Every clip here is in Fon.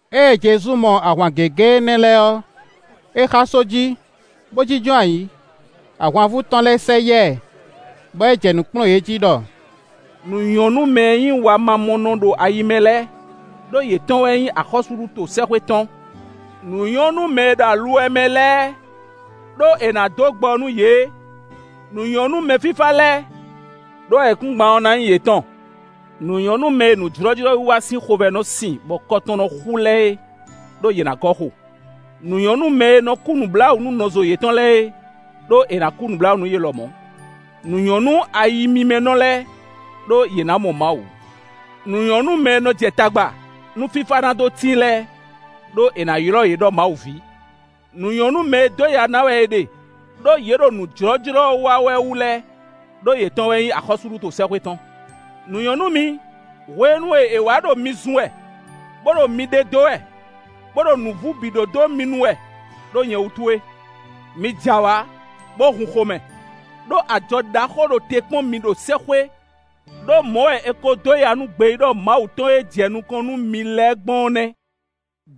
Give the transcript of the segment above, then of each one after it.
Ée Jezu mɔ ahwan gěgé énɛ́ lɛ́ɛ ɔ́, é xá só jí, bo jínjɔ́n ayǐ; ahwanvú tɔn lɛ́ɛ sɛ yá ɛ, bɔ é jɛ nǔ kplɔ́n yě jí ɖɔ: Nǔ nyɔ́ nú mɛ e nyí wamamɔnɔ ɖo ayi mɛ lɛ́ɛ, ɖó yětɔn wɛ nyí axɔ́súɖuto sɛ́xwé tɔn. Nǔ nyɔ́ nú mɛ e ɖo aluwɛ mɛ lɛ́ɛ, ɖó è nǎ dó gbɔ nú yě. Nǔ nyɔ́ nú mɛfífá lɛ́ɛ, ɖó ayǐkúngban ɔ́ na nyí yětɔn! Nǔ nyɔ́ nú mɛ e nǔjlɔ́jlɔ́wiwa sín xovɛ́ nɔ sín, bɔ kɔ tɔn nɔ xú yě lɛ́ɛ é; ɖó yě ná gɔ́ xo. Nǔ nyɔ́ nú mɛ e nɔ kú nǔbláwǔ nú nɔzo yětɔn lɛ́ɛ é, ɖó è nǎ kú nǔbláwǔ nú yě lɔmɔ̌. Nǔ nyɔ́ nú ayimímɛ́nɔ lɛ́ɛ, ɖó yě ná mɔ Mawu. Nǔ nyɔ́ nú mɛ e nɔ jɛ tagba, nú fífá ná dó tíin lɛ́ɛ, ɖó è nǎ ylɔ́ yě ɖɔ Mawu ví. Nǔ nyɔ́ nú mɛ e dó ya na wɛ è ɖe, ɖó yě ɖo nǔ jlɔ́jlɔ́ wa wɛ wú lɛ́ɛ, ɖó yětɔn wɛ nyí axɔ́súɖuto sɛ́xwé tɔn. “Nǔ nyɔ́ nú mi, hwenu e è wǎ ɖo mi zun wɛ, bó ɖo mi ɖe dó wɛ, bó ɖo nǔvú bǐ ɖó dó mi nu wɛ, ɖó nyɛ wútu é. Mi j'awǎ, bó hun xomɛ, ɖó ajɔ ɖaxó ɖo te kpɔ́n mi ɖo sɛ́xwé. Ɖó, mɔ̌ wɛ è ko dó ya nú gbeyíɖɔ Mawu tɔn e jɛ nukɔn nú mi lɛ́ɛ gbɔn ɔ́ nɛ́.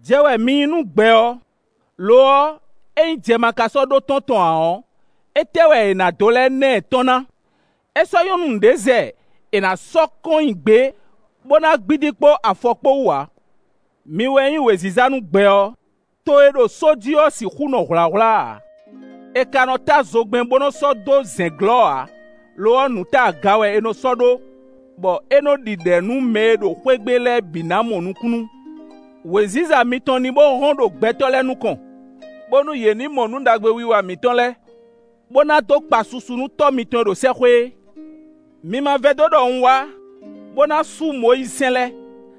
“Jɛ wɛ mi nyí nú gbɛ ɔ́. Lo ɔ́, ényí jɛ ma ka sɔ́ ɖó tɔ́n ǎ ɔ́, étɛ́ wɛ è nǎ dó lɛ́ na ɛ tɔ́n na? É sɔ́ nyɔ́ nú nǔɖé zɛ è nǎ sɔ́ kɔn nyi gbě, bó ná gbídí kpó afɔ kpó wú ǎ. “Mi wɛ nyí wěziza nú gbɛ ɔ́; to e ɖo só jí ɔ́ sixú nɔ hwlǎhwlá ǎ. È ka nɔ ta zogbɛ́n bó nɔ́ sɔ́ dó zɛ̌n glɔ́ ǎ; lo ɔ́, nǔ ta aga wɛ è nɔ sɔ́ ɖó, bɔ é nɔ́ ɖi ɖɛ̌ nú mɛ e ɖo xwé gbe lɛ́ɛ bǐ ná mɔ nukúnnú. Wěziza mitɔn ní bo hɔ́n ɖo gbɛtɔ́ lɛ́ɛ nukɔn, bónú yě ní mɔ nǔ ɖagbe wiwa mǐtɔn lɛ́ɛ, bo na dó kpa susu nú Tɔ́ mitɔn e ɖo sɛ́xwé é. “Mi ma vɛdó ɖɔ un wá, bó ná sú Mɔyízisɛ́n lɛ́ɛ,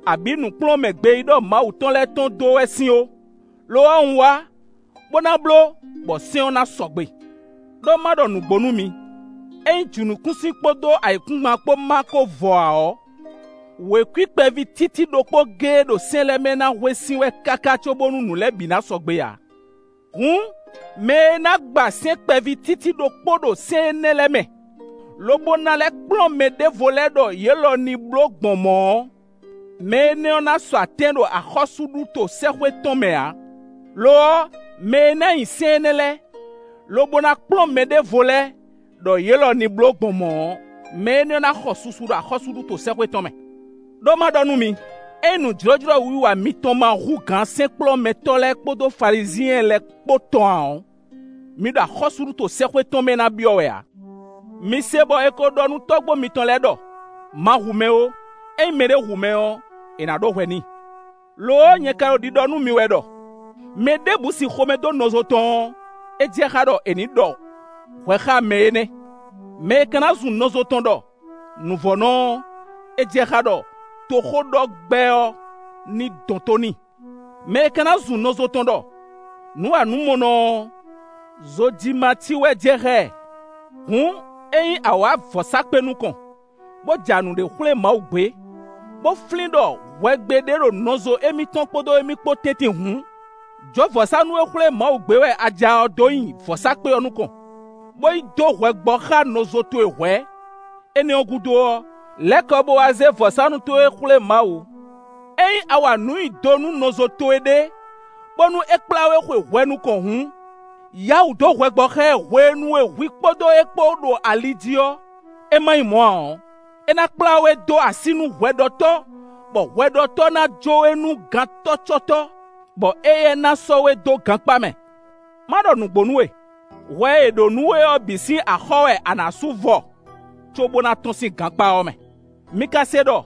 abǐ nǔkplɔ́nmɛ gbeyíɖɔ Mawu tɔn lɛ́ɛ tɔn dó wɛ sín ó. Lo ɔ́, un wá, bó ná bló, bɔ sɛ́n ɔ́ ná sɔgbe. Ɖó ma ɖɔ nǔgbó nú mi: ényí jǐnukúnsin kpódó ayǐkúngban kpó ma ko vɔ ǎ ɔ́, wěkwín kpɛví títí ɖokpó géé ɖo sɛ́n lɛ́ɛ mɛ ná hwe sín wɛ káká cóbónú nǔ lɛ́ɛ bǐ ná sɔgbe ǎ. Hǔn, mɛ e na gba sɛ́n kpɛví títí ɖokpó ɖo sɛ́n nɛ́ lɛ́ɛ mɛ, lobo ná lɛ́ kplɔ́n mɛɖěvo lɛ́ɛ ɖɔ yě lɔ ní bló gbɔn mɔ̌ ɔ́, mɛ énɛ́ ɔ́ ná sɔ atɛ́n ɖo axɔ́súɖuto sɛ́xwé tɔn mɛ ǎ. Lo ɔ́, mɛ e ná nyi sɛ́n énɛ́ lɛ́ɛ, lobo ná kplɔ́n mɛɖěvo lɛ́ɛ ɖɔ yě lɔ ní bló gbɔn mɔ̌ ɔ́, mɛ énɛ́ ɔ́ na xɔ susu ɖo axɔ́súɖuto sɛ́xwé tɔn mɛ. Ɖó, ma ɖɔ nú mi: ényí nǔjlɔ́jlɔ́wiwa mitɔn ma hú gǎn sɛ́nkplɔ́nmɛtɔ́ lɛ́ɛ kpódó Falizyɛn lɛ́ɛ kpó tɔn ǎ ɔ́, mi ɖo axɔ́súɖuto sɛ́xwé tɔn mɛ na byɔ́ wɛ ǎ. “Mi se bɔ è ko ɖɔ nú tɔ́gbó mitɔn lɛ́ɛ ɖɔ: ‘Ma hu mɛ ó; ényí mɛɖé hu mɛ ɔ́, è nǎ ɖó hwɛ n'i.’ Lo ɔ́, nyɛ ka ɖo ɖiɖɔ nú mi wɛ ɖɔ: mɛ ɖěbǔ sin xomɛ dó nɔzo tɔn ɔ́, é jɛ xá ɖɔ è nǐ ɖɔ hwɛ xá mɛ énɛ́; mɛ e ka na zun nɔzo tɔn ɖɔ: ‘Nǔvɔ́nɔ’ ɔ́, é jɛ xá ɖɔ toxóɖɔgbɛ́ ɔ́ ní dɔn tó n'i. Mɛ e ka na zun nɔzo tɔn ɖɔ: ‘Nǔwanǔmɔnɔ’ ɔ́, zojimací wɛ jɛ xá ɛ. Hǔn, ényí a wǎ vɔ̌sákpe nukɔn, bó ja nǔɖé xwlé Mawu gbé, bó flín ɖɔ hwɛgbe ɖé ɖo nɔzo émítɔn kpódó émí kpó tɛ́ntin hǔn, jó vɔ̌sánú e xwlé Mawu gbé wɛ a ja ɔ́ dó nyi vɔ̌sákpe ɔ́ nukɔn, bó yi dó hwɛ gbɔ xá nɔzo towe hwɛ̌; énɛ́ ɔ́ gúdo ɔ́, lɛ́ kɔ bo wá zé vɔ̌sánú towe xwlé Mawu. “Ényí a wa nǔ nyi do nú nɔzo towe ɖé, bónú é kplá we xwe hwɛ nukɔn hǔn, yǎ wǔ dó hwɛ gbɔ xá ɛ hwenu e hwi kpódó é kpó ɖo ali jí ɔ́, é ma nyí mɔ̌ ǎ ɔ́, é ná kplá we dó así nú hwɛɖɔtɔ́, bɔ hwɛɖɔtɔ́ ná jó we nú gantɔ́cɔ́tɔ́, bɔ éyɛ́ ná sɔ́ we dó gankpá mɛ. Ma ɖɔ nǔgbó nú we: hwɛ e è ɖǒ nú we ɔ́ bǐ sín axɔ́ wɛ a nǎ sú vɔ cóbó ná tɔ́n sín gankpá ɔ́ mɛ. “Mi ka se ɖɔ: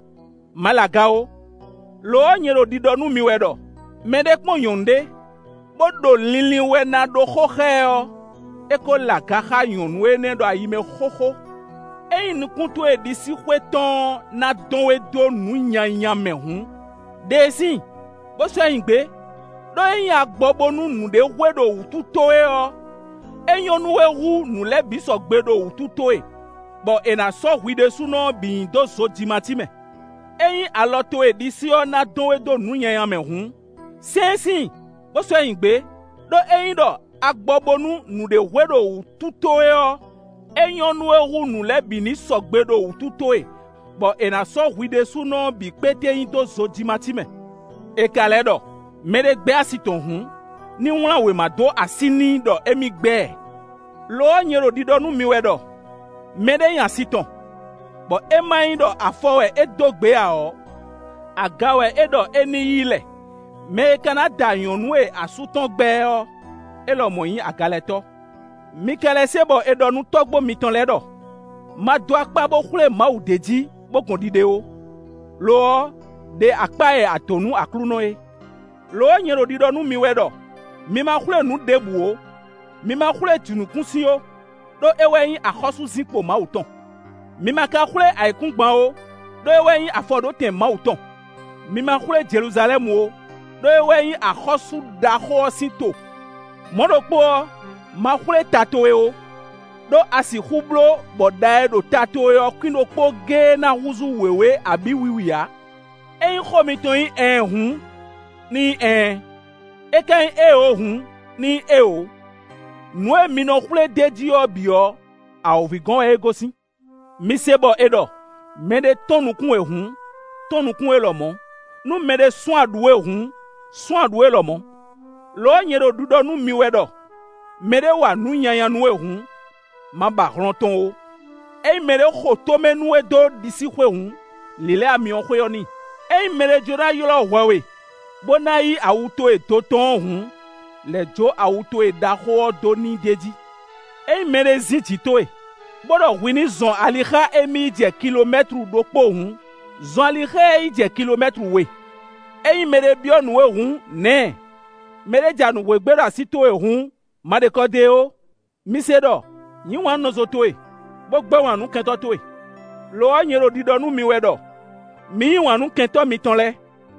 ‘Ma lɛ aga ó.’ Lo ɔ́, nyɛ ɖo ɖiɖɔ nú mi wɛ ɖɔ: mɛɖé kpɔ́n nyɔ̌nu ɖé bó ɖo linlin wɛ ná ɖó xó xá ɛ ɔ́, é ko lɛ aga xá nyɔ̌nu énɛ́ ɖo ayi mɛ xóxó. Ényí nukún towe ɖisíxwé tɔn ɔ́ na dɔn we dó nǔ nyanya mɛ hǔn, ɖe síin, bo sɔ́ nyi gbě; ɖó ényí a gbɔ bónú nǔɖé hwe ɖo wútu towe ɔ́, é nyɔ́ nú we hú nǔ lɛ́ɛ bǐ ní sɔgbe ɖo wǔtu towe bɔ è nǎ sɔ́ hwi ɖésúnɔ ɔ́ bǐ nyi dó zojimací mɛ. Ényí alɔ towe ɖisí ɔ́ na dɔn we dó nǔ nyanya mɛ hǔn, sɛ́n síin, bo sɔ́ nyi gbě; ɖó ényí ɖɔ a gbɔ bónú nǔɖé hwe ɖo wútu towe ɔ́, é nyɔ́ nú we hú nǔ lɛ́ɛ bǐ ní sɔgbe ɖo wútu towe, bɔ è nǎ sɔ́ hwi ɖésúnɔ ɔ́ bǐ kpéte nyi dó zojimací mɛ. “È ka lɛ́ ɖɔ: ‘Mɛ ɖé gbɛ́ asi tɔn hǔn, ní wlán wěma dó así n'i ɖɔ émí gbɛ́ ɛ.’ Lo ɔ́, nyɛ ɖo ɖiɖɔ nú mi wɛ ɖɔ: mɛɖé nya asi tɔn, bɔ é ma nyí ɖɔ afɔ wɛ é dó gbě ǎ ɔ́, aga wɛ é ɖɔ é ní yi lɛ. Mɛ e ka da nyɔ̌nu e asú tɔn gbɛ́ ɛ ɔ́, é lɔmɔ̌ nyí agalɛtɔ́. “Mi ka lɛ́ se bɔ è ɖɔ nú tɔ́gbó mitɔn lɛ́ɛ ɖɔ: ‘Ma dó akpá bo xwlé Mawu d'é jí bo gɔn ɖiɖe ó; lo ɔ́, ɖe akpá e a dǒ nú Aklúnɔ é.’ Lo ɔ́, nyɛ ɖo ɖiɖɔ nú mi wɛ ɖɔ: mi ma xwlé nǔ ɖěbǔ ó, mi ma xwlé jǐnukúnsin ó, ɖó é wɛ nyí axɔ́súzinkpo Mawu tɔn. Mi ma ka xwlé ayǐkúngban ó, ɖó é wɛ nyí afɔɖótɛn Mawu tɔn; mi ma xwlé Jeluzalɛ́mu ó, ɖó é wɛ nyí axɔ́sú ɖaxó ɔ́ sín to. Mɔ̌ ɖokpó ɔ́, ma xwlé ta towe ó, ɖó a sixú bló bɔ ɖa e ɖo ta towe ɔ́ kwín ɖokpó géé ná húzú wěwé abǐ wiwi ǎ. Ényí xó mitɔn nyí ‘ɛɛn’ hǔn, ní nyí ‘ɛɛn’, é ka nyí ‘éeǒ’ hǔn, ní nyí ‘éeǒ’. Nǔ e mi nɔ xwlé d'é jí ɔ́ bǐ ɔ́, awǒvi gɔ́n wɛ é gosín. “Mi se bɔ è ɖɔ: ‘Mɛ ɖé tɔ́n nukún we hǔn, tɔ́n nukún é lɔmɔ̌; nú mɛɖé sún aɖǔ we hǔn, sún aɖǔ é lɔmɔ̌.’ Lo ɔ́, nyɛ ɖo ɖiɖɔ nú mi wɛ ɖɔ: mɛɖé wa nǔ nyanya nú we hǔn, ma ba hlɔn tɔn ó; ényí mɛɖé xo tomɛ nú we dó ɖisíxwé hǔn, lǐlɛ́ amyɔxwé ɔ́ n'i. Ényí mɛɖé jló ná ylɔ́ hwɛ we, bo na yí awu towe do tɔn ɔ́ hǔn, lɛ̌ jó awu towe ɖaxó ɔ́ dó n'i d'é jí. Ényí mɛɖé zín jǐ towe, bó ɖɔ hwi ní zɔn ali xá émí yi jɛ kilomɛ́tlu ɖokpó hǔn, zɔn ali xá ɛ yi jɛ kilomɛ́tlu we. Ényí mɛɖé byɔ́ nǔ we hǔn, nǎ ɛ; mɛɖé ja nǔ hwé gbé ɖo así towe hǔn, ma ɖe kɔ dó e ó. “Mi se ɖɔ: ‘Yǐ wǎn nú nɔzo towe, bó gbɛ́ wǎn nú kɛntɔ́ towe.’ Lo ɔ́, nyɛ ɖo ɖiɖɔ nú mi wɛ ɖɔ: mi yí wǎn nú kɛntɔ́ mitɔn lɛ́ɛ.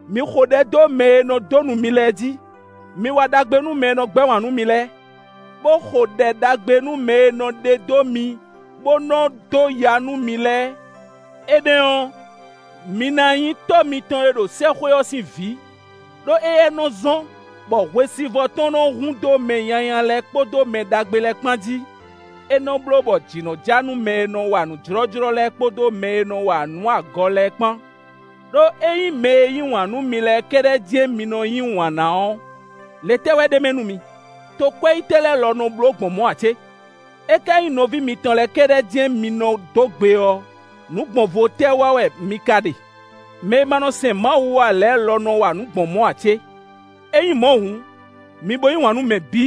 Mi xo ɖɛ dó mɛ e nɔ dó nu mi lɛ́ɛ jí. Mi wa ɖagbe nú mɛ e nɔ gbɛ́ wǎn nú mi lɛ́ɛ, bó xo ɖɛ ɖagbe nú mɛ e nɔ ɖe dó mi bó nɔ́ dó ya nú mi lɛ́ɛ. Énɛ́ ɔ́, mi na nyí Tɔ́ mitɔn e ɖo sɛ́xwé ɔ́ sín vǐ; ɖó éyɛ́ nɔ́ zɔ́n, bɔ hwesivɔ́ tɔn nɔ́ hun dó mɛ nyanya lɛ́ɛ kpódó mɛ ɖagbe lɛ́ɛ kpan jí; é nɔ́ bló bɔ jǐ nɔ́ ja nú mɛ e nɔ wa nǔ jlɔ́jlɔ́ lɛ́ɛ kpódó mɛ e nɔ wa nǔ agɔ lɛ́ɛ kpán. Ɖó ényí mɛ e yí wǎn nú mi lɛ́ɛ kɛ́ɖɛ́ jɛ́n mi nɔ yí wǎn ná ɔ́, le tɛ́ wɛ ɖ'é mɛ nú mi? Tokwɛ́yítɔ́ lɛ́ɛ lɔ nɔ bló gbɔn mɔ̌ ǎ cé? É ka nyí nɔví mitɔn lɛ́ɛ kɛ́ɖɛ́ jɛ́n mi nɔ dó gbe ɔ́, nǔ gbɔn vo tɛ́ wa wɛ mi ka ɖe? Mɛ e ma nɔ sɛn Mawu ǎ lɛ́ɛ lɔ nɔ wa nǔ gbɔn mɔ̌ ǎ cé? Ényí mɔ̌ hǔn, mi bo yí wǎn nú mɛ bǐ,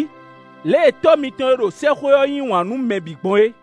lě e Tɔ́ mitɔn e ɖo sɛ́xwé ɔ́ yí wǎn nú mɛ bǐ gbɔn é.”